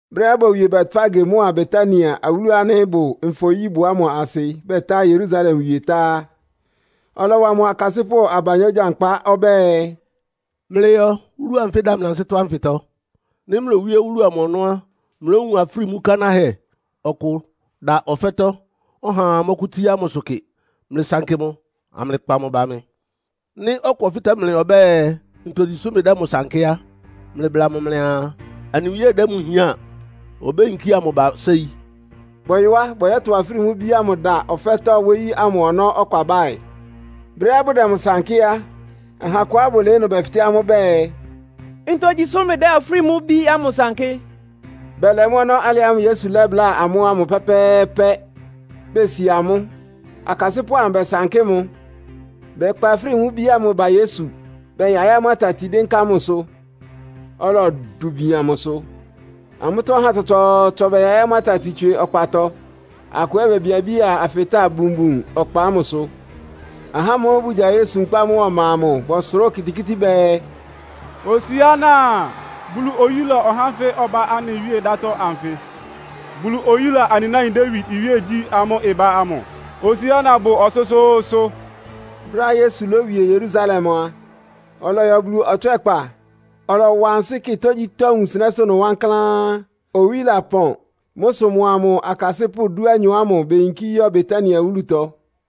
Brɛ́á bowie Betfage mʋ́a Betania, awúlu ánɩ́ ɩbʋ Nfɔ-nyíbʋ ámʋ asɩ, batá Yerusalem wie tá á, ɔlɔwa mʋ akasɩ́pʋ́ abanyɔ́ gyankpá. Ɔbɛ́ɛ, “Mlɩyɔ wúlu anfɩ́ ɩda mlɩ ansɩ́tɔ́ ánfɩtɔ. Nɩ́ mlowíe wúlu amʋ ɔnɔ́ á, mlówun afrímú kanáhɛ ɔkʋ da ɔfɛ́tɔ́, ɔhaa mɔ́kʋ́tsíá mʋsʋ kɩ. Mlɩsankɩ mʋ, amlɩkpa mʋ ba mɩ. Nɩ́ ɔkʋ ɔfɩ́tɛ́ mlɩ ɔbɛ́ɛ, ‘Ntogyi sʋ́ mlɩdɛ́ mʋ sankɩ́?’ á, mlɩbla mʋ mlɩaa, ‘Anɩ Wíe dɛ́ mʋ hián. Obéyinkía mʋ ba séi.’” Bɔyɔ á, bɔyɔ́tʋ afrímú ibí ámʋ da ɔfɛ́tɔ́ wóyí ámʋ ɔnɔ́ ɔkpabáɩ. Brɛ́á bʋdɛ mʋ sankɩ́ á, aha akʋá bʋlɩɩ́ ɩnʋ bɛfɩtɛ́ amʋ́ bɛɛ, “Ntogyi sʋ́ mlɩdɛ́ afrímú ibí ámʋ sankɩ́.” Bɛlɛ mʋ́ ɔnɔ́ alɩ ámʋ́ʋ́ Yesu lɛ́bláa amʋ́ ámʋ pɛ́pɛ́ɛ́pɛ́. Besi amʋ́; akasɩ́pʋ́ amʋ bɛsankɩ́ mʋ́. Bɛkpa afrímú ibí ámʋ ba Yesu. Bɛyaɩ́ amʋ́ atati dɩ́nká mʋsʋ, ɔlɔdʋ bian mʋsʋ. Amʋ́tɔ́ ahá tsɔtsɔɔtsɔ bɛyaɩ́ amʋ́ atati tswɩ ɔkpatɔ, akʋ ɛ́ bebiabía afɩtáa bunbun ɔkpa ámʋsʋ. Ahá ámʋ́ʋ́ bʋgya Yesu nkpá mʋ́a ɔma amʋ bɔsʋrá okitikíti bɛɛ, “Hosiána! Bulu oyúla ɔhá ánfɩ ɔbá anɩ Wíe dátɔ́ ánfɩ! Bulu oyúla anɩ náin Dawid iwíegyí ámʋ́ʋ́ ɩbá ámʋ! Hosiána bʋ ɔsʋ́sʋ́ʋ́sʋ́!” Brɛ́á Yesu lówie Yerusalem a, ɔlɔyɔ Bulu ɔtswɛ́kpa, ɔlɔwa ansɩ́ kɩ tógyítɔ́ wunsɩnɛ́sʋ́ ɩnʋ wankláán. Owí lapɔn. Mʋ́ sʋ mʋa mʋ akasɩ́pʋ́ dúanyɔ ámʋ beyinkí yɔ́ Betania wúlutɔ.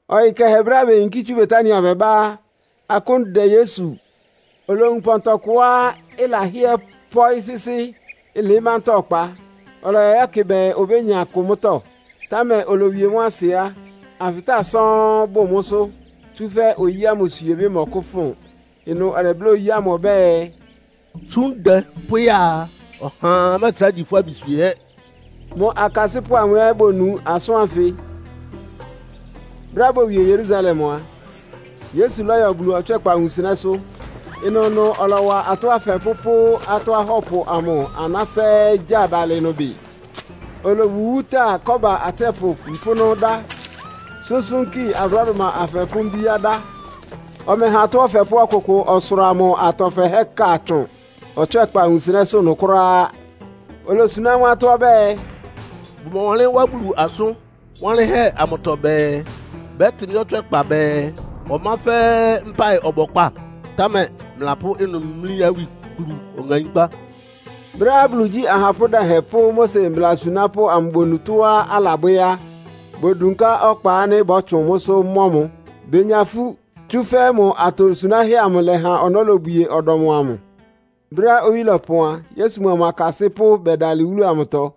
Ɔyɩ kɛhɛ brɛ́á beyinkí tsú Betania bɛbá á, akʋ́n dɛ Yesu. Olowun pɔntɔ kʋá ɩlahɩ́ɛ́ pɔ́ɩ́ sɩ́sɩ́, ɩlɩɩ́ mantáa ɔkpa. Ɔlɔyɔ yɛ́kɩ bɛɛ obénya kʋ mʋ́tɔ́. Támɛ olowie mʋ́ asɩ á, afɩtáa sɔ́ɔ́n bʋ mʋ́sʋ́, tsúfɛ́ oyí ámʋ swiebɩ́ mɔkʋ́fʋn. Ɩnʋ ɔlɛbláa oyí ámʋ ɔbɛ́ɛ, “Tsú ndɛ pʋ́ya a, ɔhaa mɛ́ɛtrá gyi fʋ́ abi swiehɛ́.” Mʋ akasɩ́pʋ́ amʋ ɛ́ bonu asʋ́n ánfɩ. Brɛ́á bowie Yerusalem a, Yesu lɔ́yɔ Bulu ɔtswɛ́kpa wunsɩnɛ́sʋ́. Ɩnʋnʋ ɔlɔwa atɔ́ afɛpʋ́ pʋ́ atɔ́ ahɔ́pʋ amʋ aná fɛ́ɛ́ gyáa dalɩ ɩnʋ bɩ. Olowuwúta kɔ́ba atsɛ́pʋ mpʋ́nʋ́ dá, súnsúnki abrɔ́dʋma afɛpʋ́ mbíá dá. Ɔmɛha atɔ́ ɔfɛpʋ́ ɔkʋkʋ ɔsʋra mʋ atɔ fɛhɛ́ ka tsʋn Ɔtswɛ́kpa wunsɩnɛ́sʋ́ ɩnʋ kʋ́ráá. Olosuná amʋ́ atɔ́ ɔbɛ́ɛ, “Bʋmɔwanlɩ́n wá Bulu asʋn wanlɩ́nhɛ́ amʋtɔ bɛɛ, ‘Bɛ́tɩ mɩ́ ɔtswɛ́kpa bɛɛ, ɔmá fɛ́ɛ́ mpáɩ ɔbɔkpá?’ Támɛ mlɩlapʋ́ ɩnʋ mlí awikplu ɔŋaínkpá.” Brɛ́á Bulu igyí ahapʋ́ dɛhɛn pʋ́ Mose mbla asunápʋ́ amʋ bonu tɔ́á alabwɛ́ á, bodunká ɔkpa ánɩ́ bɔ́tsʋn mʋ́sʋ́ mɔ́ mʋ. Benya ifú, tsúfɛ́ mʋ atosunáhɛ́ amʋ lɛha ɔnɔ́ lobwie ɔdɔm amʋ. Brɛ́á owí lɔpɔn a, Yesu mʋa mʋ akasɩ́pʋ́ bɛdalɩ wúlu amʋtɔ.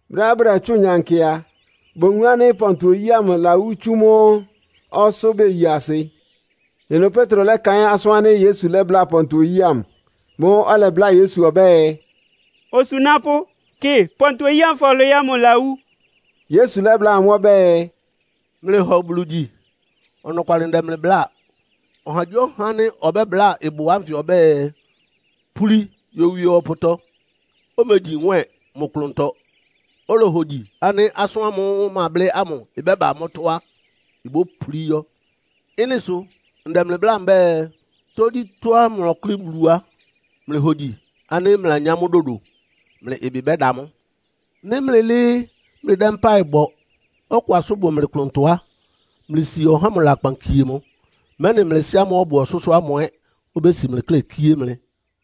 Brɛ́á bʋdɛtsʋ́ʋn nyankɩ a, bowun ánɩ́ pɔntɔ oyí ámʋ ɩlawú tsú mʋ́ ɔsʋ́ beyi asɩ. Ɩnʋ Petro lɛ́kaɩ́n asʋ́n ánɩ́ Yesu lɛ́bláa pɔntɔ oyí ámʋ. Mʋ́ʋ́ ɔlɛbláa Yesu ɔbɛ́ɛ, “Osunápʋ́, kɩ, pɔntɔ oyí ámʋ́ʋ́ fɔlwɩɩ́ ámʋ ɩlawú!” Yesu lɛ́bláa amʋ́ ɔbɛ́ɛ, “Mlɩhɔ Bulu gyi. Ɔnɔkwalɩ ndɛ mlɩ bláa, ɔhagyíɔha ánɩ́ ɔbɛ́bláa ɩbʋ ánfɩ ɔbɛ́ɛ, ‘Púli yowie ɔpʋtɔ’, omegyi nwɛ́ɛn mʋ klʋntɔ, olohogyi ánɩ́ asʋ́n ámʋ́ʋ́ mablɩ́ ámʋ ɩbɛ́ba mʋ́tɔ́ á, ibópulí yɔ́. Ɩ́nɩ sʋ ndɛ mlɩ bláa mbɛ́ɛ, tógyítɔ́á mlɔkʋ́lɩ́ Bulu á, mlɩhogyi ánɩ́ mlɩlanyá mʋ́ dodo. Mlɩ ɩbɩ bɛ́da mʋ́. Nɩ́ mlɩlɩ́ɩ́ mlɩdɛ́ mpáɩ bɔ, ɔkʋ asʋ́n bʋ mlɩ klʋntɔ á, mlɩsi ɔhá ámʋ lakpan kie mʋ, mɛ́nɩ mlɩ Sɩ́ ámʋ́ʋ́ ɔbʋ ɔsʋ́sʋ́ ámʋ ɛ́ obési mlɩ klɛ́ kíé mlɩ.”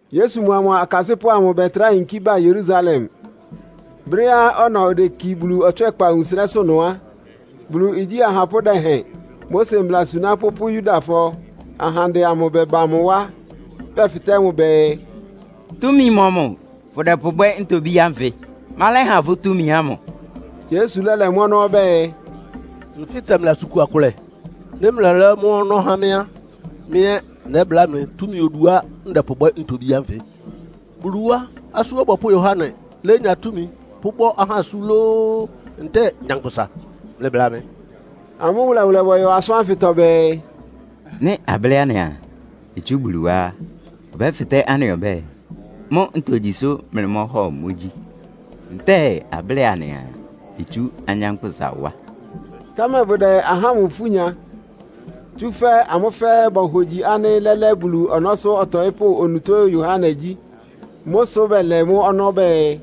Yesu mʋa mʋ akasɩ́pʋ́ amʋ bɛtrá yinkí ba Yerusalem. Brɛ́á ɔna odeki Bulu ɔtswɛ́kpa wunsɩnɛ́sʋ́ ɩnʋ á, Bulu igyí ahapʋ́ dɛhɛn, Mose mbla asunápʋ́ pʋ́ Yudafɔ ahandɛ amʋ bɛba mʋ wá. Bɛfɩtɛ́ mʋ bɛɛ, “Túmi mɔmʋ fʋ́dɛpʋbwɛ́ ntobí ánfɩ? Ma lɛ́ha fʋ́ túmi ámʋ?” Yesu lɛ́lɛ́ mʋ́ ɔnɔ́ ɔbɛ́ɛ, “Nfɩ́tɛ mlɩ asʋn kua kʋlɛ. Nɩ́ mlɛlɛ́ mʋ́ ɔnɔ́ há mɩ́ á, mɩ́ ɛ́ nɛ́bláa mlɩ túmi oduá ndɛpʋbwɛ́ ntobí ánfɩ. Bulu wá Asú Ɔbɔpʋ́ Yohane lénya túmi pʋ́bɔ́ ahá asú lóó, ntɛ́ɛ nyankpʋsa? Mlɩbla mɩ!” Amʋ́ wʋlɛwʋlɛ bɔyɔ asʋ́n ánfɩtɔ bɛɛ, “Nɩ́ ablɩ́ anɩaa itsú Bulu wá á, ɔbɛ́fɩtɛ́ anɩ ɔbɛ́ɛ, mʋ́ ntogyi sʋ́ mlɩmɔ́hɔ mʋ gyi? Ntɛ́ɛ ablɩ́ɩ anɩaa itsú anyánkpʋ́sa wá?” Támɛ bʋdɛ ahá ámʋ ifú nya, tsúfɛ́ amʋ́ fɛ́ɛ́ bohogyi ánɩ́ lɛ́lɛ́ Bulu ɔnɔ́sʋ́ ɔtɔɩ́pʋ́ onutó Yohane gyí. Mʋ́ sʋ bɛlɛ mʋ́ ɔnɔ́ bɛɛ,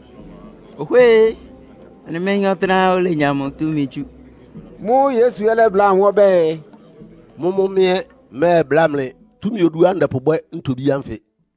“Ohwée! Anɩméyín ɔtɩ́nɛ́á olenya mʋ túmi tsú.” Mʋ́ʋ́ Yesu ɛ́ lɛ́bláa amʋ́ ɔbɛ́ɛ, “Mʋ́mʋ́ mɩ́ ɛ́ mmɛ́ɛbláa mlɩ túmi oduá ndɛpʋbwɛ́ ntobí ánfɩ.”